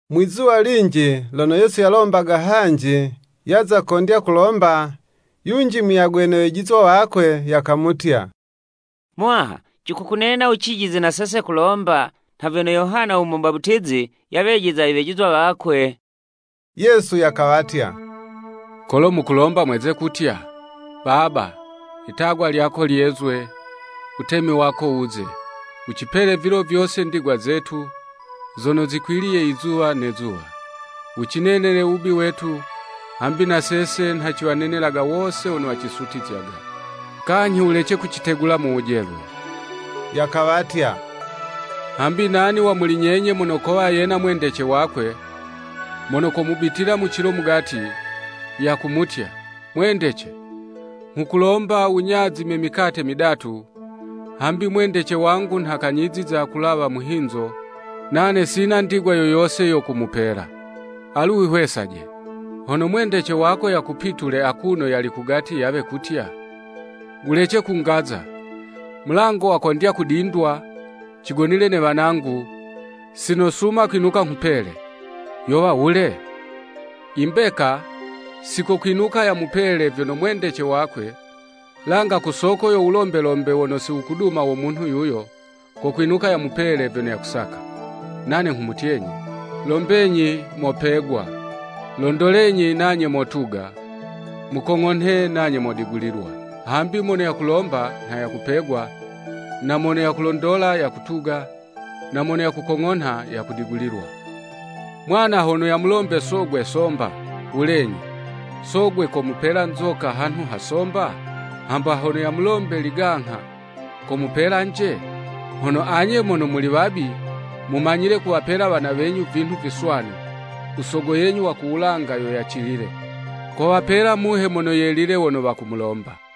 Mwi'zuwa linji, lono Yesu yalombaga hanji, yaza kondya kulomba, yunji muyagwe ne wejizwa wakwe, yakamutya, “Muwaha cikukunena wucijize na sese kulomba nha vyono Yohana u Mubaputizi yawejiza iwejizwa wakwe.” Yesu yakawatya, “Kolo mukulomba mweze kutya, ‘Baba, Itagwa lyako lyezwe, Wutemi wako wuze. Wucipele vilo vyose ndigwa zetu, zono zikwiliye izuwa ne zuwa. Wucinenele wubi wetu hambi na sese, nha ciwanenelaga wose wono wacisutizyaga. Kanyhi wulece kucitegula mu wujelwe.’” Yakawatya, “Hambi nani wa muli nyenye mono kowa na mwendece wakwe, mono komubitila mu cilo mugati, yakumutya, ‘Mwendece, nghukulomba wunyazime mikate midatu; hambi mwendece wangu nha kanyiziza kalawa muhinzo, nane sina ndigwa yo yose yo kumupela.’ Alu wihwesaje, hono mwendece wako yakupitule akuno yali kugati yawe kutya, ‘Wulece kungaza: mulango wakondya kudindwa, cigonile ne wanangu, sinosuma kwinuka nghupele!’ Yowa wule? I mbeka, si kokwinuka yamupele vyono mwendece wakwe, langa ku soko yo wulombelombe wono si wukuduma wo munhu yuyo, kokwinuka yamupele vyono yakusaka. “Nane nghumutyenyi: Lombenyi mopegwa; londolenyi nanye motuga; mukong'onhe nanye modigulilwa. Hambi mono yakulomba nha yakupegwa; na mono yakulondola, yakutuga; na mono yakukong'onha, yakudigulilwa. Mwana hono yamulombe sogwe somba, wulenyi, sogwe komupela nzoka hanhu ha somba? Hamba hono yamulombe ligangha, komupela 'nje? Hono anye mono muli wabi, mumanyile kuwapela wana wenyu vinhu viswanu, u sogo yenyu wa ku wulanga yo yacilile, kowapela Muhe Mono Yelile wono wakumulomba.”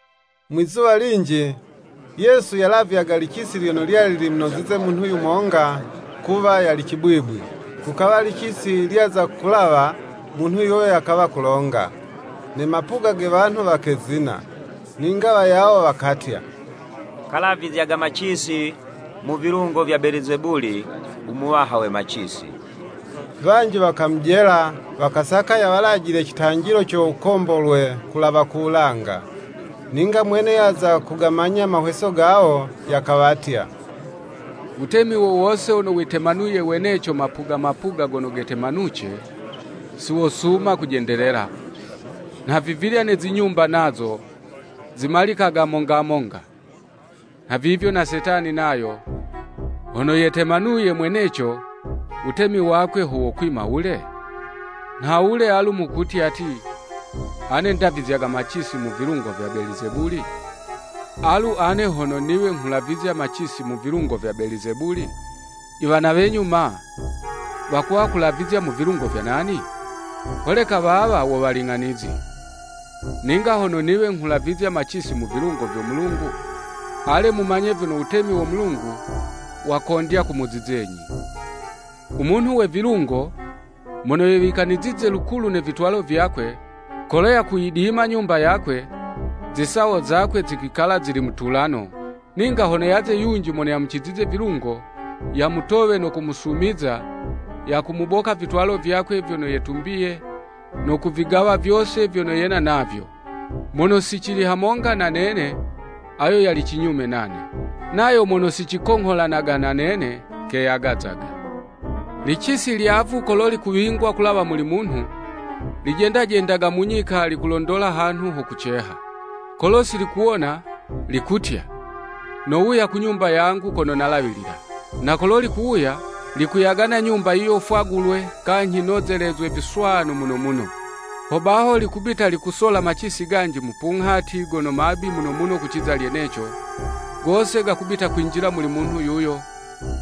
Mwi'zuwa linji Yesu yalavyaga licisi lyono lyali limunozize munhu yumonga kuwa yali cibwibwi. Kukawa licisi lyaza kulawa, munhu yuyo yakawa kulonga; ne mapuga ge wanhu wakezina. Ninga wayawo wakatya, “Kalavizyaga macisi mu vilungo vya Belizebuli u muwaha we macisi.” Wanji wakamujela, wakasaka yawalajile citanjilo co wukombolwe kulawa ku wulanga. Ninga mwene yaza kugamanya mahweso gawo, yakawatya, “Wutemi wowose wono witemanuye weneco mapuga mapuga gono gatemanuce, si wosuma kujendelela, nhavivilya ne zinyumba nazo, zimalikaga monga monga. Nhavivyo na Setani nayo, hono yetemanuye mweneco, wutemi wakwe ho wokwima wule? Nhawule alu mukutya ti, ane ndavizyaga macisi mu vilungo vya Belizebuli? Alu ane hono niwe nghulavizya macisi mu vilungo vya Belizebuli, i wana wenyu ma, wakuwa kulavizya mu vilungo vya nani? Holeka wawa wo waling'anizi. Ninga hono niwe nghulavizya macisi mu vilungo vyo Mulungu, ale mumanye vyono wutemi wo Mulungu, wakondya kumuzizenyi.” Munhu we vilungo, mono yewikanizize lukulu ne vitwalo vyakwe, kolo yakuyidima nyumba yakwe, zisawo zakwe zikwikala zili mutulano; ninga hono yaze yunji mono yamucizize vilungo, yamutowe no kumusumiza, yakumuboka vitwalo vyakwe vyono yetumbiye, no kuvigawa vyose vyono yena navyo. Mono si cili hamonga na nene ayo yali cinyume nane; nayo mono si cikongholanaga na nene, keyagazaga. “Licisi lyavu kolo likuwingwa kulawa muli munhu, lijendajendaga mu nyika likulondola hanhu ho kuceha: kolo si likuhawona, likutya, ‘Nowuya ku nyumba yangu kono nalawilila.’ Na kolo likuwuya, likuyagana nyumba yiyo fwagulwe, kanyhi nozelezwe viswanu muno muno. Hobaho likubita likusola macisi ganji mupunghati gono mabi muno kuciza lyeneco, gose gakubita kwinjila muli munhu yuyo,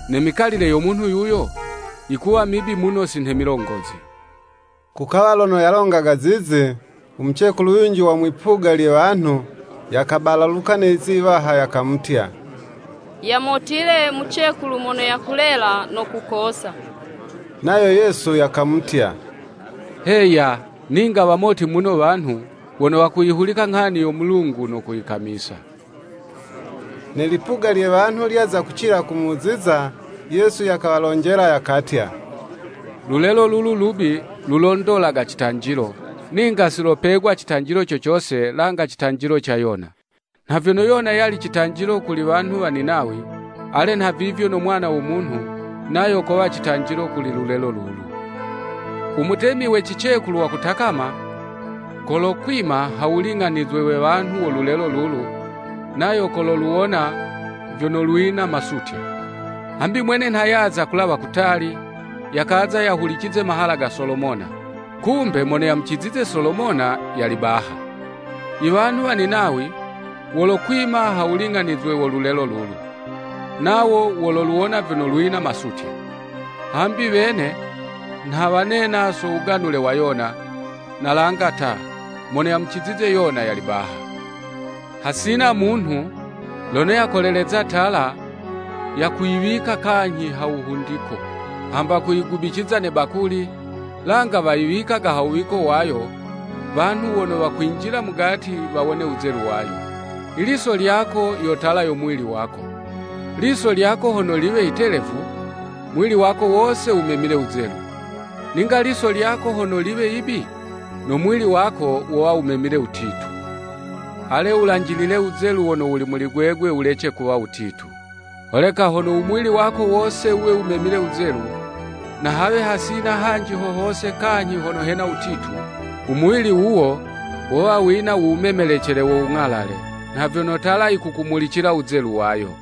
ne mikalile yo munhu yuyo, yikuwa mibi muno si nhe milongozi.” Kukawa lono yalongaga zizi, u mucekulu yunji wa mwipuga lye wanhu, yakabalaluka ne lizi iwaha, yakamutya, “Yamotile, mucekulu mono yakulela, no kukosa.” Nayo Yesu yakamutya, “Heya, ninga wamoti muno wanhu wono wakuyihulika nghani yo Mulungu no kuyikamisa.” Ne lipuga lye wanhu lyaza kucila kumuziza, Yesu yakawalonjela yakatya, “Lulelo lulu lubi; lulondolaga citanjilo; ninga si lopegwa citanjilo cocose, langa citanjilo ca Yona. Nha vyono Yona yali citanjilo kuli wanhu wa Ninawi, ale nhavivyo no Mwana wo Munhu nayo kowa citanjilo kuli lulelo lulu. U mutemi we cicekulu wa kutakama, kolokwima ha wuling'anizwe we wanhu wo lulelo lulu, nayo kololuwona vyono lwina masutya. Hambi mwene nha yaza kulawa kutali, yakaza yahulicize mahala ga Solomona; kumbe mono yamucizize Solomona, yali baha. I wanhu wa Ninawi wolokwima ha wuling'anizwe wo lulelo lulu, nawo wololuwona vyono lwina masutya. Hambi wene nha wanena so wuganule wa Yona; na langa ta, mono yamucizize Yona yali baha.” “Hasina munhu, lono yakoleleza tala, yakuyiwika kanyhi ha wuhundiko, hamba kuyigubiciza ne bakuli, langa wayiwikaga ha wuwiko wayo, wanhu wono wakwinjila mugati wawone wuzelu wayo. Iliso lyako yo tala yo muwili wako, liso lyako hono liwe yitelevu, muwili wako wose wumemile wuzelu. Ninga liso lyako hono liwe yibi, no muwili wako wowa wumemile wutitu. Ale wulanjilile wuzelu wono wuli muli gwegwe wulece kuwa wutitu. Holeka hono u muwili wako wose wuwe wumemile wuzelu, na hawe hasina hanji hohose kanyhi hono hena wutitu, u muwili wuwo wowa wina u wumemelecele wo wung'alale, nha vyono tala yikukumulicila wuzelu wayo.”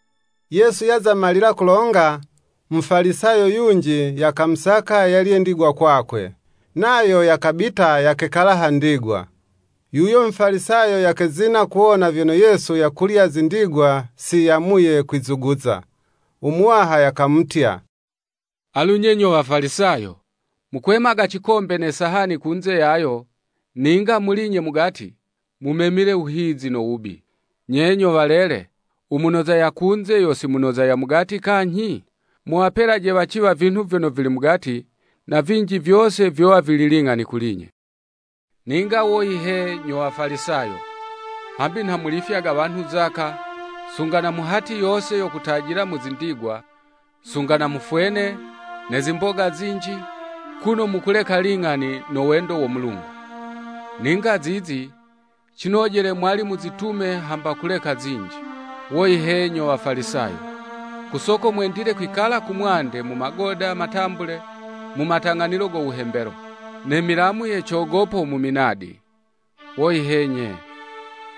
Yesu yaza malila kulonga, Mufalisayo yunji yakamusaka yalye ndigwa kwakwe; nayo yakabita yakekala ha ndigwa. Yuyo Mufalisayo yakezina kuwona vyono Yesu yakulya zindigwa si yamuye kwizuguza. U Muwaha yakamutya, “Alu nye nyo Wafalisayo, mukwemaga cikombe ne sahani kunze yayo, ninga muli'nye mugati, mumemile wuhizi no wubi. Nye nyo walele, u munoza ya kunze yo si munoza ya mugati kanyhi? Muwapelaje waciwa vinhu vyono vili mugati; na vinji vyose, vyowa vili ling'ani kuli'nye.” “Ninga woyi he nyo Wafalisayo! Hambi nha mulifyaga wanhu zaka, sunga na mu hati yose yo kutajila mu zindigwa, sunga na mu fwene, ne zimboga zinji, kuno mukuleka ling'ani no wendo wo Mulungu. Ninga zizi cinojele mwali muzitume hamba kuleka zinji. Woyi he nyo Wafalisayo! Ku soko mwendile kwikala kumwande mu magoda matambule mu matang'anilo go wuhembelo, ne milamu ye cogopo mu minadi. Woyi he nye!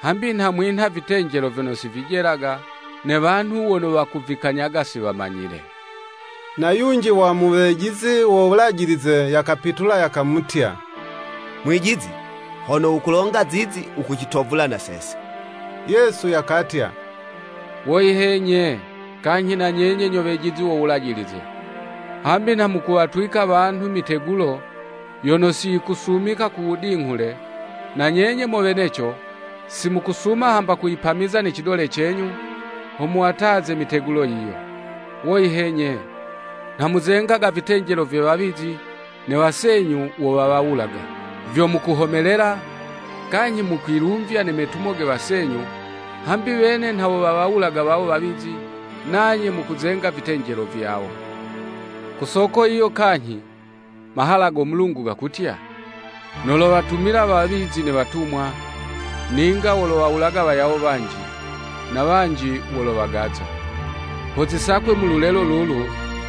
Hambi nha mwinha vitenjelo vyono si vijelaga, ne wanhu wono wakuvikanyaga si wamanyile.” Na yunji wa mu wejizi wo Wulajilize yakapitula yakamutya, “Mwijizi, hono wukulonga zizi, wukucitovula na sese.” Yesu yakatya, “Woyi he nye, kanyhi na nyenye nyo wejizi wo Wulajilize! Hambi nha mukuwatwika wanhu mitegulo, yono si yikusumika kuwudinghule, na nyenye mo weneco, si mukusuma hamba kuyipamiza ne cidole cenyu, ho muwataze mitegulo yiyo.” Woyi he nye, nha muzengaga vitenjelo vye wawizi, ne wasenyu wo wawawulaga. Vyo mukuhomelela, kanyhi mukwilumvya ne metumo ge wasenyu, hambi wene nha wo wawawulaga wawo wawizi, nanye mukuzenga vitenjelo vyawo. Ku soko yiyo kanyhi, mahala go Mulungu gakutya, “Nolowatumila wawizi ne watumwa; ninga wolowawulaga wayawo wanji, na wanji wolowagaza.” Ho zisakwe muli lulelo lulu,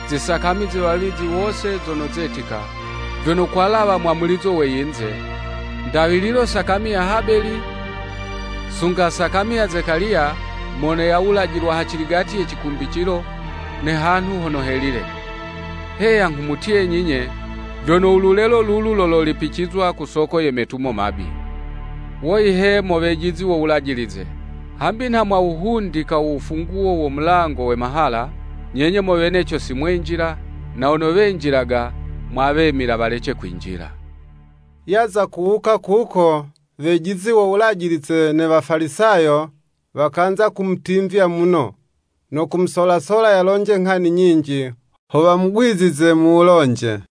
zisakami ze wawizi wose zono zetika, vyono kwalawa mwamulizo we yinze; ndawililo sakami ya Habeli sunga sakami ya Zekaliya, mono yawulajilwa haciligati ye cikumbicilo ne hanhu hono helile; heya nghumutyenyi 'nye, vyono u lulelo lulu lololipicizwa ku soko ye metumo mabi. “Woyi he mo wejizi wo Wulajilize! Hambi nha mwawuhundika wufunguwo wo mulango we mahala, nyenye mo weneco si mwenjila, na wono wenjilaga mwawemila walece kwinjila.” Yaza kuwuka kuko, wejizi wo Wulajilize ne Wafalisayo, wakanza kumutimvya muno, no kumusolasola yalonje nghani nyinji; ho wamugwizize mu wulonje.